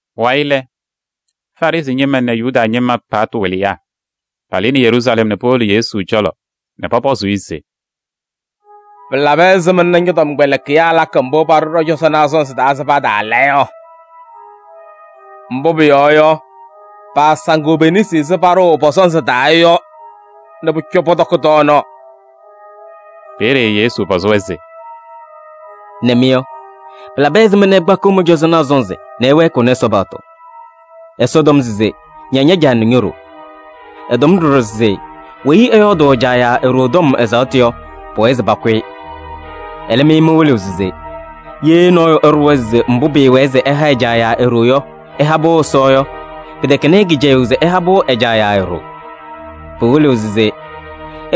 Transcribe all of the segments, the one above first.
Pʋwayɩ lɛ, Farɩsɩ ñɩma nɛ Yuda ñɩma paɣtʋ wɩlɩyaa palɩnɩ Yeruusalɛm nɛ powolo Yesu cɔlɔ nɛ pɔpɔzɩ-ɩ se: “Pɩlabɩ ɛzɩma nɛ ñɔ-tɔmkpɛlɩkɩyaa lakɩ mbʋ paɖʋ ɖɔ-cɔzɔnaa sɔnzɩ taa se pataala yɔ? Mbʋ pʋyɔɔ yɔ, paasaŋɩɣ pe-nesi ɛzɩ paɖʋʋ pɔ-sɔnzɩ taa yɔ nɛ pʋcɔ pɔtɔkɩ tɔɔnaɣ.” Peeye Yesu pɔzɩ-wɛ se: “Nɛ mɩ yɔ, pɩlabɩ ɛzɩma nɛ ɩkpakɩɣ mɩ-cɔzɔnaa sɔnzɩ nɛ ɩwɛɛkɩɣnɩ Ɛsɔ paɣtʋ? Ɛsɔ tɔm se: ‘Ña ña-caa nɛ ño-ɖoo.’ Ɛtɔm ɖɔɖɔ se: ‘Weyi ɛyɔɔdʋʋ ɛ-caa yaa e-ɖoo tɔm ɛzaɣtʋ yɔ, pʋwɛɛ se pakʋ-ɩ.’ Ɛlɛ, mɩ mɩwɩlɩɣ se: ‘Ye nɔɔyʋ ɛɖʋwa se mbʋ pɩɩwɛɛ se ɛha ɛ-caa yaa e-ɖoo yɔ, ɛha-pʋ Ɛsɔ’ yɔ, pɩtɛkɛnɩ-ɩ kɩcɛyʋʋ se ɛha-pʋ ɛ-caa yaa e-ɖoo. Pɩwɩlɩɣ se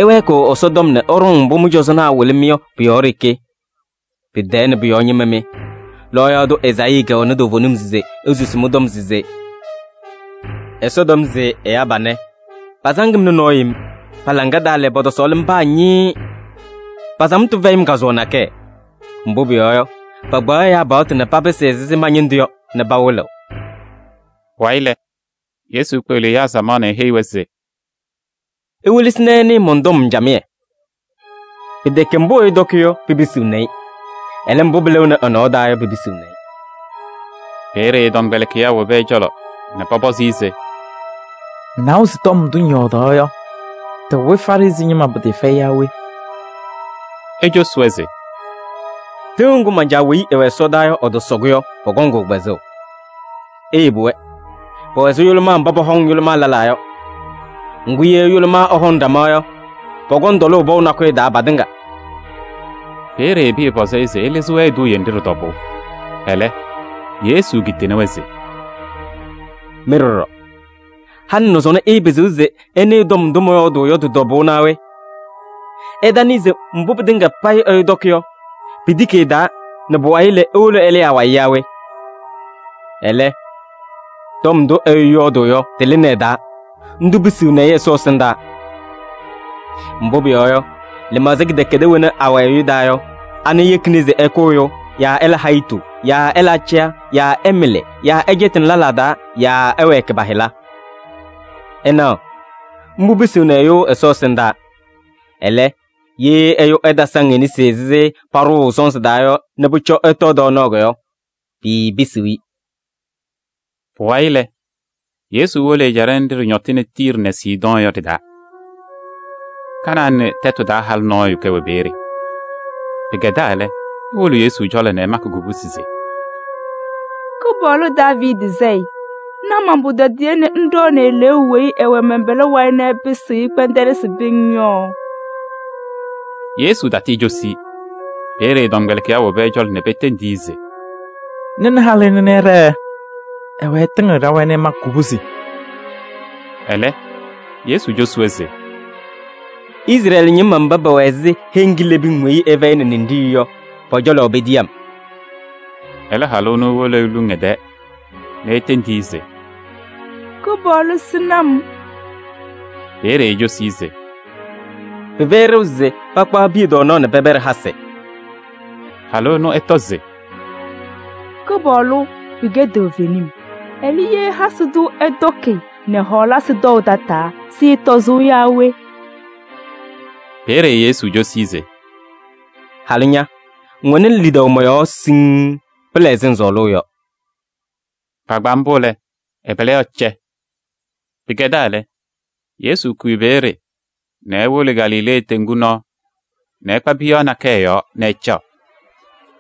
ɩwɛɛkɩɣ Ɛsɔtɔm nɛ ɩɖɔŋ mbʋ mɩ-cɔzɔnaa wɩlɩ-mɩ yɔ pʋ-yɔɔ ɖeke. Tɛɛ nɛ pʋ-yɔɔ ñɩma mɩ! Lɔɔyaɣ tʋ Ezaayii kɛwɛnɩ toovenim se esusi mɩ-tɔm se: ‘Ɛsɔ tɔm se ɛyaa panɛ, pasaŋ-m nɛ nɔɔ yem. Pa-laŋa taa lɛ, pɔtɔsɔɔlɩ-m paa ñɩɩɩ. Pa-samtʋ fɛyɩ-m kazʋwa nakɛyɛ. Mbʋ pʋyɔɔ yɔ, pakpaɣ ɛyaa paɣtʋ nɛ papɩsɩ ɛzɩ ma-ñɩndʋ yɔ nɛ pawɩlɩɣ.’” Pʋwayɩ lɛ, Yesu kpeɣli ɛyaa samaɣ nɛ eheyi-wɛ se: “Iwelesi nɛ ɩnɩɩ mɔn-tɔm camɩyɛ. Pɩtɛkɛ mbʋ ɛyʋ tɔkɩ yɔ, pipisiɣni-i. Ɛlɛ, mbʋ pɩlɩɣnɩ ɛ-nɔɔ taa yɔ, pipisiɣni-i.” Peeye ɛ-tɔmkpɛlɩkɩyaa wobi ɛ-cɔlɔ nɛ pɔpɔzɩ-ɩ se: “Ŋnawa se tɔm ndʋ ŋyɔɔdaɣ yɔ, tɩwɩ Farɩsɩ ñɩma pɩtɩɩfɛyɩ yaa we?” Ecosi-wɛ se: “Tɩʋ ŋgʋ man-Caa weyi ɛwɛ ɛsɔdaa yɔ, ɛtɔsɔ-kʋ yɔ, pɔkɔŋ-kʋ kpɛzʋʋ. Iyebi-wɛ: pɛwɛ ɛzɩ yʋlʋmaa mba pɔhɔŋ yʋlʋmaa lɛlaa yɔ! Ŋgʋ, ye yʋlʋmaa ɛhɔŋ ɖama yɔ, pɔkɔŋ tɔlʋʋ pɔʋ nakʋyʋ taa patɩŋa.” Peeye Pɩyɛ pɔzɩ-ɩ se ɛlɩzɩ-wɛ eduuye nɖɩ ɖɩ-tɔbʋʋ. Ɛlɛ, Yesu kitini-wɛ se: “Mɩ ɖɔɖɔ, halɩ nɛ sɔnɔ ɩɩpɩzɩɣ se ɩnɩɩ tɔm ndʋ mɔyɔɔdʋʋ yɔ tɩ-tɔbʋʋ naa we? Ɩtanɩɩ se mbʋ pɩtɩŋa payɩ ɛyʋ tɔkɩ yɔ, pitiki ɛ-taa nɛ pʋwayɩ lɛ, ewolo ɛlɩɩ awayɩ yaa we? Ɛlɛ, tɔm ndʋ ɛyʋ yɔɔdʋʋ yɔ, tɩlɩnɩ ɛ-taa, ndʋ pisiɣni-i Ɛsɔ ɛsɩndaa. Mbʋ pʋyɔɔ yɔ, lɩmaɣza kɩdɛkɛdɛɛ wena awɛ ɛyʋ taa yɔ, ana yekini se ɛkʋ ɛyʋ yaa ɛla hayitu yaa ɛla acɛyɛ yaa ɛmɩlɩ yaa ɛcɛtɩnɩ lɛlaa taa yaa ɛwɛɛkɩ pa-hɩla. Ɩnaɣ, mbʋ pisiɣni ɛyʋ Ɛsɔ ɛsɩndaa. Ɛlɛ, ye ɛyʋ ɛtasaŋ e-nesi ɛzɩ paɖʋʋ sɔnzɩ taa yɔ nɛ pʋcɔ ɛtɔɔ tɔɔnaɣ yɔ, piipisiɣ-i.” Pʋwayɩ lɛ, Yesu wolo ɛjaɖɛ nɖɩ ɖɩñɔtɩnɩ Tiiri nɛ Sidɔɔ yɔ ɖɩ-taa. Kanaanɩ tɛtʋ taa halʋ nɔɔyʋ kɛwɛ peeye. Pɩkɛdaa lɛ, ewolo Yesu cɔlɔ nɛ ɛmakɩ kubusi se: “Kɩpaɣlʋ, Daaviidi Sayɩ! Na man-pʋtɔdɩyɛ nɛ ŋɖɔɔnɩ eleeu weyi ɛwɛ mɛn-pɛlɛ wayɩ nɛ ɛpɩsɩɣ-ɩ kpɛndɛlɩsɩ pɩŋŋ yɔ!” Yesu tatɩɩcosuu-i. Peeye ɛ-tɔmkpɛlɩkɩyaa wobi ɛ-cɔlɔ nɛ petendi-i se: “Nɩnɩ halʋ ɛnʋ nɛ ɛɖɛɛ. Ɛwɛɛ ɛtɩŋɩɣ ɖa-wayɩ nɛ ɛmakɩ kubusi.” Ɛlɛ, Yesu cosi-wɛ se: “Izrɛɛlɩ ñɩma mba pɛwɛ ɛzɩ heŋ kilebiŋ weyi ɩfɛyɩnɩ ninɖiɣyu yɔ, pɔ-cɔlɔ petiyi-m.” Ɛlɛ halʋ ɛnʋ ewolo eluŋ ɛ-tɛɛ nɛ etendi-i se: “Kɩpaɣlʋ! Sɩnɩ-m!” Peeye ecosi-i se: “Pɩfɛyɩ ɖeu se pakpaɣ piya tɔɔnaɣ nɛ pɛpɛɖɩ hasɩ.” Halʋ ɛnʋ ɛtɔ se: “Kɩpaɣlʋ! Pɩkɛ toovenim. Ɛlɛ, ye hasɩ tʋ ɛtɔkɩ nɛ hɔɔlasɩ tɔʋ tataa, sɩɩtɔzʋʋ yaa we?” Peeye Yesu cosi-i se: “Halʋ ña! Ŋwɛnɩ lidaʋ mɔ-yɔɔ siŋŋ. Pɩla ɛzɩ ŋsɔɔlʋʋ yɔ.” Kpaagbaa mbʋ lɛ, ɛ-pɛlɛ yɔɔ cɛ. Pɩkɛdaa lɛ, Yesu kʋyɩ peeye nɛ ewolo Galilee teŋgu nɔɔ nɛ ɛkpa piyaɣ nakɛyɛ yɔɔ nɛ ɛcaɣ.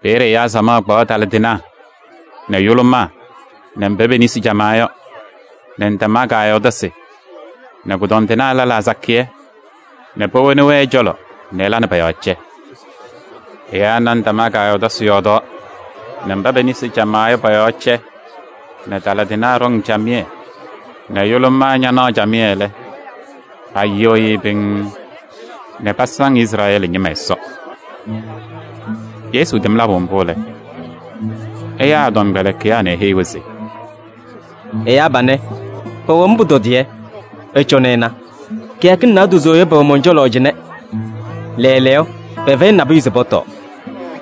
Peeye ɛyaa samaɣ kpaɣ taladɩnaa nɛ yʋlʋmaa nɛ mba pe-nesi camaa yɔ nɛ ndamaa kaayɔɔdasɩ nɛ kʋdɔndɩnaa lɛlaa sakɩyɛ nɛ powoni-wɛ ɛ-cɔlɔ nɛ ɛla nɛ pɔ-yɔɔ cɛ. Ɛyaa na ndamaa kaayɔɔdasɩ yɔɔdaɣ nɛ mba pe-nesi camaa yɔ pɔ-yɔɔ cɛ nɛ taladɩnaa ɖɔŋ camɩyɛ nɛ yʋlʋmaa ñanaɣ lɛ, payɩɣyɩɣ-ɩ pɩŋŋ nɛ pasaŋ Izrɛɛlɩ ñɩma Ɛsɔ. Yesu tɛm labʋ mbʋ lɛ, ɛyaa ɛ-tɔmkpɛlɩkɩyaa nɛ eheyi-wɛ se: “Ɛyaa panɛ, pɛwɛ-m pʋtɔdɩyɛ. Ɩcɔnɩ ɩna, kɩyakɩŋ naadozo yɔ pɛwɛ mɔn-cɔlɔ cɩnɛ. Lɛɛlɛɛyɔ, pɛfɛyɩnɩ nabʋyʋ se pɔtɔɔ.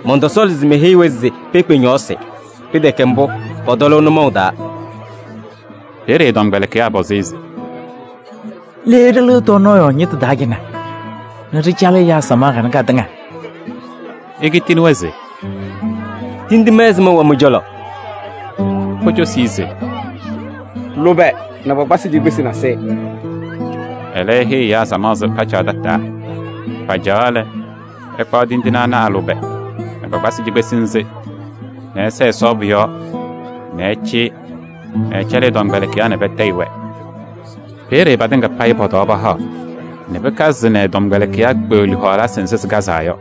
Mɔntɔsɔɔlɩ se meheyi-wɛ se pekpe ñɔɔsɩ, pɩtɛkɛ mbʋ, pɔtɔlʋʋ nʋmɔʋ taa.” Peeye ɛ-tɔmkpɛlɩkɩyaa pɔzɩ-ɩ se: “Le ɖɩlɩɣ tɔɔnaɣ yɔɔ ñɩtʋ taa cɩnɛ nɛ ɖɩcalɩ ɛyaa samaɣ kanɛ katɩŋa?” Ekitini-wɛ se: “Tindine ɛzɩma wɛ mɩ-cɔlɔ?” Pocosi-i se: “Lʋbɛ nɛ kpakpasɩ cikpesi nasɩyɩ.” Ɛlɛ, eheyi ɛyaa se pacaɣ tataa. Pacaɣaɣ lɛ, ɛkpaɣ tindine ana a-lʋbɛ nɛ kpakpasɩ cikpesi nzɩ nɛ ɛsɛɛ Ɛsɔ pʋ-yɔɔ nɛ ɛcɩyɩ nɛ ɛcɛlɩ ɛ-tɔmkpɛlɩkɩyaa nɛ patayɩ-wɛ. Peeye patɩŋa payɩ pɔtɔwaa pahaɣ nɛ pɩkazɩ nɛ ɛ-tɔmkpɛlɩkɩyaa kpeɣli hɔɔlasɩ nzɩ sɩkazaa yɔ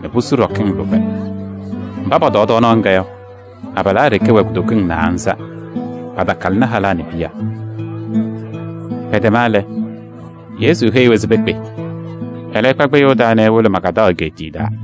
nɛ pusu ɖɔkɩŋ lʋbɛ. Mba pɔtɔɔ tɔɔnaɣ ŋga yɔ, abalaa ɖeke wɛ kutokiŋ naanza. Patakalɩnɩ halaa nɛ piya. Pɛtɛma lɛ, Yesu heyi-wɛ se pekpe. Ɛlɛ ɛkpa kpɩyʋʋ taa nɛ ewolo Magaadaɣ egeetiye taa.